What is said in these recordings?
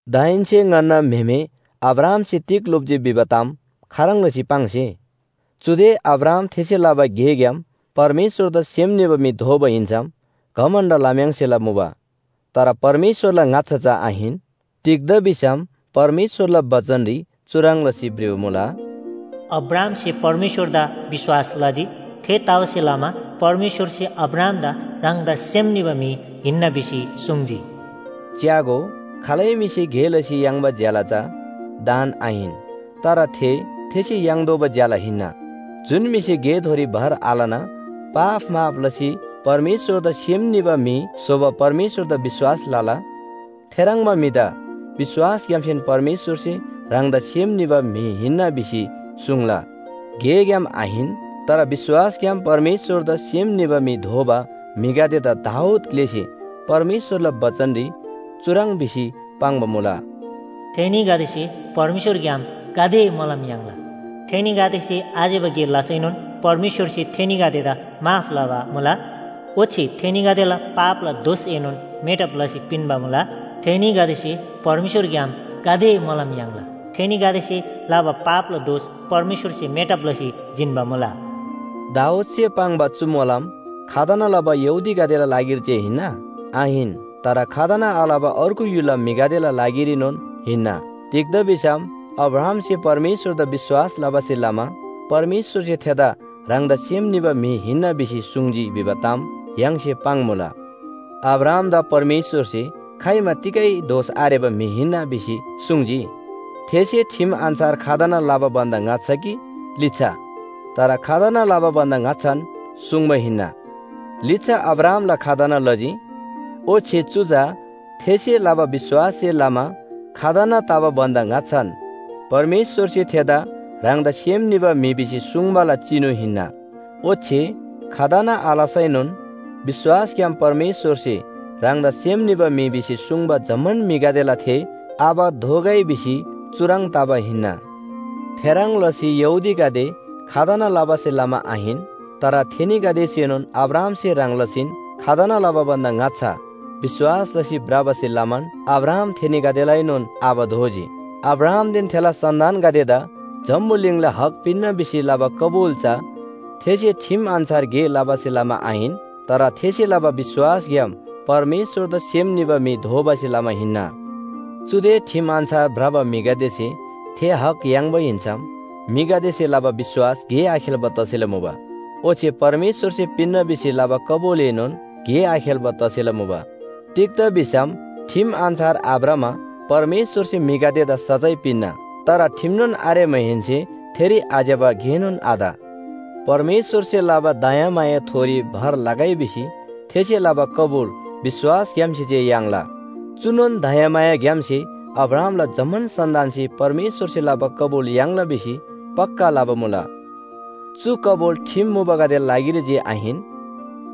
दाहेन्‍से ङन्‍ना म्‍हेमे अब्राहामसे तिग लोप्‍जी भिबा ताम खाह्रङ् लसी पाङ्से? चुदे अब्राहाम थेसे लबा गेग्‍याम परमेश्‍वरदा सेम निबा म्‍हि दोबा हिन्‍सम घमण्‍ड लम्‍याङ्सेला मुबा। तर परमेश्‍वरला ङाच्‍छा चा आहिन। तिग्‍दा भिसम परमेश्‍वरला बचनरी चुह्रङ् लसी भ्रिबा मुला, “अब्राहामसे परमेश्‍वरदा विश्‍वास लजी। थेतबासेलमा परमेश्‍वरसे अब्राहामदा ह्राङदा सेम निबा म्‍हि हिन्‍ना भिसी सुङ्जी।” च्‍यागो, खालै म्‍हिसे गे लसी याङ्बा ज्‍याला चा दान आहिन, तर थे थेसे याङ्तोःबा ज्‍याला हिन्‍ना। जुन म्‍हिसे गेथोरी भर आलना पाप माफ लसी परमेश्‍वरदा सेम निबा म्‍हि स्‍होबा परमेश्‍वरदा विश्‍वास लला, थेह्रङ्बा म्‍हिदा विश्‍वासग्‍यामसेन परमेश्‍वरसे ह्राङदा सेम निबा म्‍हि हिन्‍ना भिसी सुङ्ला। गेग्‍याम आहिन, तर विश्‍वासग्‍याम परमेश्‍वरदा सेम निबा म्‍हि दोबा म्‍हिगदेदा दाऊद ग्‍लेसे परमेश्‍वरला बचनरी चुह्रङ् भिसी पाङ्बा मुला। “थेनीगदेसे परमेश्‍वरग्‍याम गाते मोलम याङ्ला, थेनीगदेसे आज्‍यबा गे लसैनोन परमेश्‍वरसे थेनीगदेदा माफ लबा मुला। ओच्‍छे थेनीगदेला पापला दोषएनोन मेटब लसी पिन्‍बा मुला। थेनीगदेसे परमेश्‍वरग्‍याम गाते मोलम याङ्ला, थेनीगदेसे लबा पापला दोष परमेश्‍वरसे मेटब लसी जिन्‍बा मुला।” दाऊदसे पाङ्बा चु मोलम खतना लबा यहूदीगदेला लागिरी जे हिन्‍ना? आहिन। तर खतना आलबा अर्गु य्‍हुलला म्‍हिगदेला लागिरीनोन हिन्‍ना। तिग्‍दा भिसम अब्राहामसे परमेश्‍वरदा विश्‍वास लबासे लमा परमेश्‍वरसे थेदा ह्राङदा सेम निबा म्‍हि हिन्‍ना भिसी सुङ्जी भिबा ताम य्‍हाङसे पाङ्‌मुला। अब्राहामदा परमेश्‍वरसे खाइमा तिगै दोष आरेबा म्‍हि हिन्‍ना भिसी सुङ्जी? थेसे ठिम अन्‍छार खतना लबा भन्‍दा ङाच्‍छा कि लिच्‍छा? तर खतना लबा भन्‍दा ङाच्‍छान सुङ्बा हिन्‍ना। लिच्‍छा अब्राहामला खतना लजी, ओच्‍छे चु चा थेसे लबा विश्‍वाससे लमा खतना तबा भन्‍दा ङाच्‍छान परमेश्‍वरसे थेदा ह्राङदा सेम निबा म्‍हि भिसी सुङ्बाला चिनु हिन्‍ना। ओच्‍छे खतना आलसैनोन विश्‍वासग्‍याम परमेश्‍वरसे ह्राङदा सेम निबा म्‍हि भिसी सुङ्बा जम्‍मान म्‍हिगदेला थे आबा दोगै भिसी चुह्रङ् तबा हिन्‍ना। थेह्रङ् लसी यहूदीगदे खतना लबासे लमा आहिन, तर थेनीगदेसेनोन अब्राहामसे ह्रङ् लसीन खतना लबा भन्‍दा ङाच्‍छा विश्‍वास लसी भ्रबासे लमान अब्राहाम थेनीगदेलाएनोन आबा दोजी। अब्राहामदेन थेला सन्‍तानगदेदा जम्‍बुलिङला हक पिन्‍ना भिसी लबा कबुल चा थेसे ठिम अन्‍छार गे लबासे लमा आहिन। तर थेसे लबा विश्‍वासग्‍याम परमेश्‍वरदा सेम निबा म्‍हि दोबासे लमा हिन्‍ना। चुदे ठिम अन्‍छार भ्रबा म्‍हिगदेसे थे हक याङ्बा हिन्‍सम म्‍हिगदेसे लबा विश्‍वास गे आखेल्‍बा तसेला मुबा। ओच्‍छे परमेश्‍वरसे पिन्‍ना भिसी लबा कबुलएनोन गे आखेल्‍बा तसेला मुबा। तिग्‍दा भिसम ठिम अन्‍छार आभ्रमा परमेश्‍वरसे म्‍हिगदेदा सजाय पिन्‍ना। तर ठिमनोन आरेमाहेन्‍से थेरी आज्‍यबा गेनोन आत। परमेश्‍वरसे लबा दयामायाथोरी भर लगै भिसी थेसे लबा कबुल विश्‍वासग्‍यामसे जे याङ्ला। चुनोन दयामायाग्‍यामसे अब्राहामला जम्‍मान सन्‍तानसे परमेश्‍वरसे लबा कबुल याङ्ला भिसी पक्‍का लबा मुला। चु कबुल ठिम मुबागदेला लागिरी जे आहिन,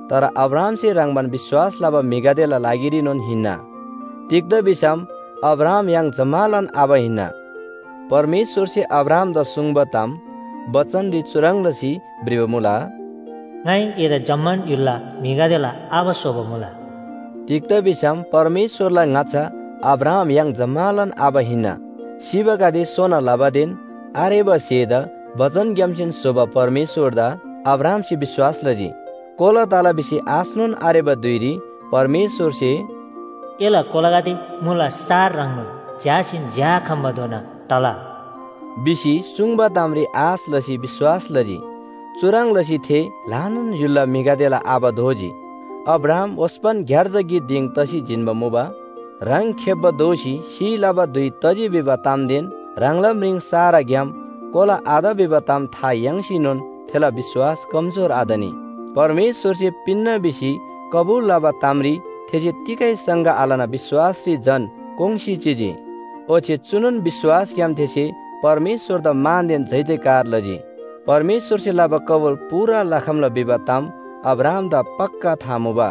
तर अब्राहामसे ह्रङ्‌बान विश्‍वास लबा म्‍हिगदेला लागिरीनोन हिन्‍ना। तिग्‍दा भिसम अब्राहाम य्‍हाङ जम्‍मालान आबा हिन्‍ना। परमेश्‍वरसे अब्राहामदा सुङ्बा ताम बचनरी चुह्रङ् लसी भ्रिबा मुला, “ङाइ एदा जम्‍मान य्‍हुलला म्‍हिगदेला आबा स्‍होबा मुला।” तिग्‍दा भिसम परमेश्‍वरला ङाच्‍छा अब्राहाम य्‍हाङ जम्‍मालान आबा हिन्‍ना। सिबागदेदा सोना लबादेन आरेबा स्‍हेदा बचनग्‍यामसेन स्‍होबा परमेश्‍वरदा अब्राहामसे विश्‍वास लजी। कोला तला भिसी आशनोन आरेबा धुइरी परमेश्‍वरसे “एला कोलागदे मुला सार ह्रङ्नोन झ्‍यासीन झ्‍याआखम्‍बाधोना तला” भिसी सुङ्बा तामरी आश लसी विश्‍वास लजी। चुह्रङ् लसी थे ल्‍हानान य्‍हुलला म्‍हिगदेला आबा दोजी। अब्राहाम ओस्‍पन ग्‍यार्जा गिक दिङ तसी जिन्‍बा मुबा। ह्राङ खेप्‍बा दोसी सिइ लबा धुइ तजी भिबा तामदेन ह्राङला म्रिङ साराग्‍याम कोला आत भिबा ताम था याङ्सीनोन थेला विश्‍वास कमजोर आतनी। परमेश्‍वरसे पिन्‍ना भिसी कबुल लबा तामरी थेसे तिगै शङ्का आलना विश्‍वासरी झन कोङ्‌सी चिजी, ओच्‍छे चुनोन विश्‍वासग्‍याम थेसे परमेश्‍वरदा मानदेन जयजयकार लजी। परमेश्‍वरसे लबा कबुल पूरा लखम्‍ला भिबा ताम अब्राहामदा पक्‍का था मुबा।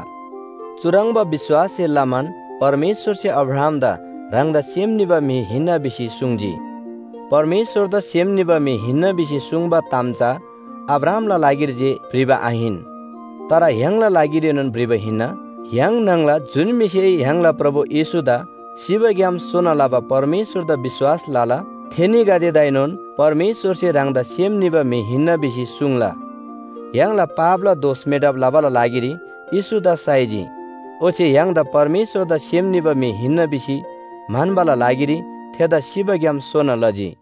चुह्रङ्बा विश्‍वाससे लमान परमेश्‍वरसे अब्राहामदा “ह्राङदा सेम निबा म्‍हि हिन्‍ना” भिसी सुङ्जी। “परमेश्‍वरदा सेम निबा म्‍हि हिन्‍ना” भिसी सुङ्बा ताम चा अब्राहामला लागिरी जे भ्रिबा आहिन, तर य्‍हाङला लागिरीनोन भ्रिबा हिन्‍ना। य्‍हाङ न्‍हङला जुन म्‍हिसे य्‍हाङला प्रभु येशूदा सिबाग्‍याम सोना लबा परमेश्‍वरदा विश्‍वास लला, थेनीगदेदाएनोन परमेश्‍वरसे ह्राङदा सेम निबा म्‍हि हिन्‍ना भिसी सुङ्ला। य्‍हाङला पापला दोष मेटब लबाला लागिरी येशूदा साइजी, ओच्‍छे य्‍हाङदा परमेश्‍वरदा सेम निबा म्‍हि हिन्‍ना भिसी म्‍हन्‍बाला लागिरी थेदा सिबाग्‍याम सोना लजी।